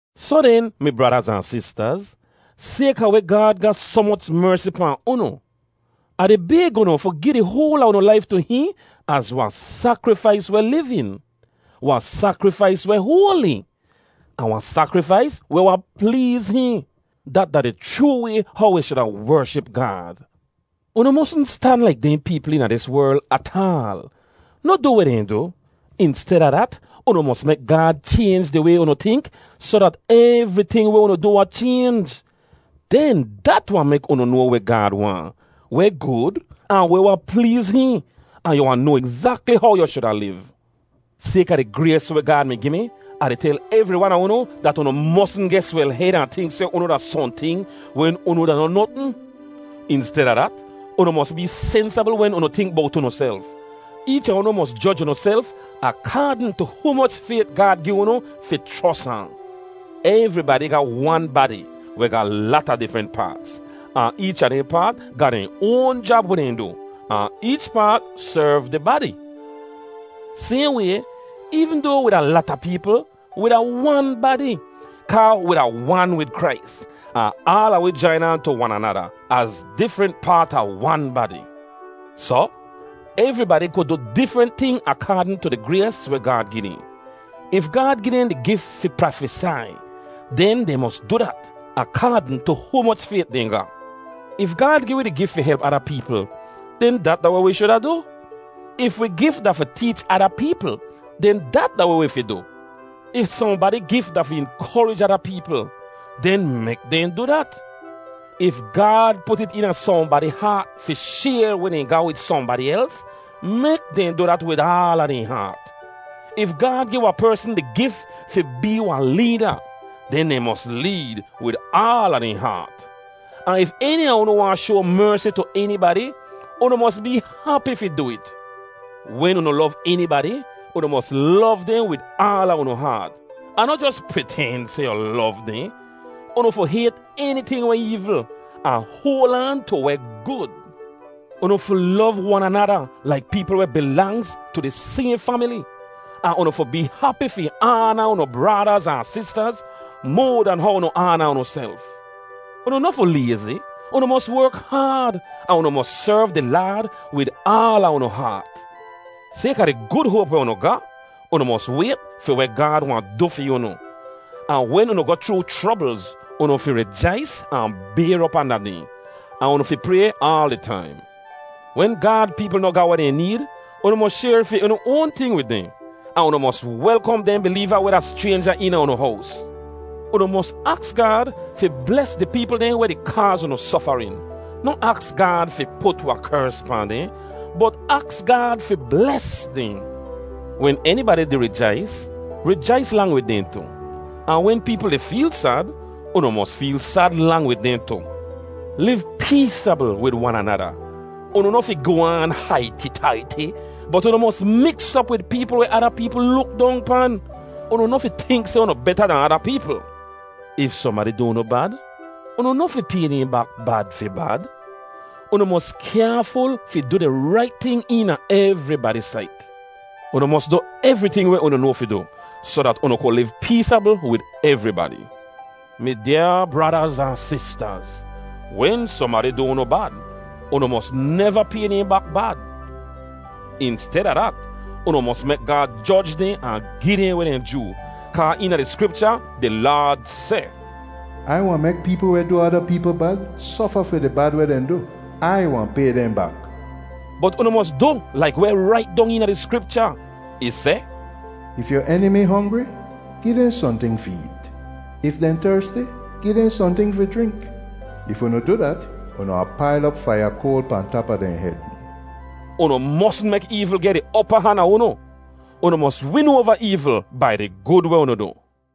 Soh den, mi bradaz ahn sistaz, sayka weh Gaad ga soh moch mersi pahn unu, Ah di bayg unu fi gi di hoal a unu laif tu hihn az wahn sakrifais weh livin, wahn sakrifais weh hoali, ahn wahn sakrifais weh wahn pleez hihn. Dat da di chroo way how wi shuda wership Gaad. Unu mosn stan laik dehn peepl eena dis werl ataal. Noh du weh dehn du. Insteda dat, unu mos mek Gaad chaynj di way unu tink soh dat evriting weh unu du wahn chaynj. Den dat wahn mek unu noa weh Gaad waahn, weh gud, ahn weh wahn pleez hihn, ahn yu wahn noa egzakli how yu shuda liv. Sayka di grays weh Gaad mi gi mi, Ah di tel evri wan a unu dat unu mosn geh swel-hed ahn tink seh unu da sohnting wen unu da noh notn. Insteda dat, unu mos bee sensabl wen unu tink bowt unuself. Eech a unu mos joj unuself akaadn tu humoch fayt Gaad gi unu fi chros ahn. Evribadi ga wan badi weh ga lata difrent paats, ahn eech a dehn paat ga dehn oan jab weh dehn du, ahn eech paat serv di badi. Sayhn way, eevn doa wi da lata peepl, wi da wan badi, kaa wi da wan wid Krais, ahn aala wi jain aan tu wan anada az difrent paat a wan badi. Soh, evribadi ku du difrent ting akaadn tu di grays weh Gaad gi dehn. If Gaad gi dehn di gif fi prafesai, den dehn mos du dat akaadn tu humoch fayt dehn ga. If Gaad gi wi di gif fi help ada peepl, den dat da weh wi shuda du. If wi gif da fi teech ada peepl, den dat da weh wi fi du. If sohnbadi gif da fi inkorij ada peepl, den mek dehn du dat. If Gaad put it eena sohnbadi haat fi shayr weh dehn ga wid sohnbadi els, mek dehn du dat wid aala dehn haat. If Gaad gi wahn persn di gif fi bee wahn leeda, den dehn mos leed wid aala dehn haat. Ahn if eni a unu wahn shoa mersi tu enibadi, unu mos bee hapi fi du it. Wen unu lov enibadi, unu mos lov dehn wid aala unu haat, ahn noh jos priten seh yu lov dehn. Unu fi hayt eniting weh eevl, ahn hoal aan tu weh gud. Unu fi lov wan anada laik peepl weh bilangz tu di sayhn famili. Ahn unu fi bee hapi fi aana unu bradaz ahn sistaz moa dan how unu aana unuself Unu noh fi layzi; unu mos werk haad, ahn unu mos serv di Laad wid aala unu haat. Sayka di gud hoap weh unu ga, unu mos wayt fi weh Gaad wahn du fi unu. Ahn wen unu di goh chroo chroblz, unu fi rijais ahn bayr op anda dehn. Ahn unu fi pray aal di taim. Wen Gaad peepl noh ga weh dehn need, unu mos shayr fi unu oan ting wid dehn, ahn unu mos welkom dehn bileeva weh da schraynja eena unu hows. Unu mos aks Gaad fi bles di peepl dehn weh di kaaz unu sofarin. Noh aks Gaad fi put wahn kers pahn dehn, bot aks Gaad fi bles dehn. Wen enibadi di rijais, rijais lang wid dehn tu. Ahn wen peepl di feel sad, unu mos feel sad lang wid dehn tu. Liv peesabl wid wan anada. Unu noh fi goh aan haiti-taiti, bot unu mos miks op wid peepl weh ada peepl luk dong pan. Unu noh fi tink seh unu beta dahn ada peepl. If sohnbadi du unu bad, unu noh fi pay dehn bak bad fi bad. Unu mos kyaaful fi du di rait ting eena evribadi sait. Unu mos du evriting weh unu noa fi du soh dat unu ku liv peesabl wid evribadi. Mi dyaa bradaz ahn sistaz, wen sohnbadi du unu bad, unu mos neva pay dehn bak bad. Insteda dat, unu mos mek Gaad joj dehn ahn gi dehn weh dehn joo, kaa eena di Skripcha di Laad seh, “Ai wahn mek peepl weh du ada peepl bad sofa fi di bad weh dehn du. Ai wahn pay dehn bak.” Bot unu mos du laik weh rait dong eena di Skripcha. Ih seh, “If yu enimi hongri, gi dehn sohnting fi eet. If dehn tersti, gi dehn sohnting fi jrink. If unu du dat, unu wahn pail op faiya koal pahn tap a dehn hed.” Unu mosn mek eevl geh di opa han a unu. Unu mos win oava eevl bai di gud weh unu du.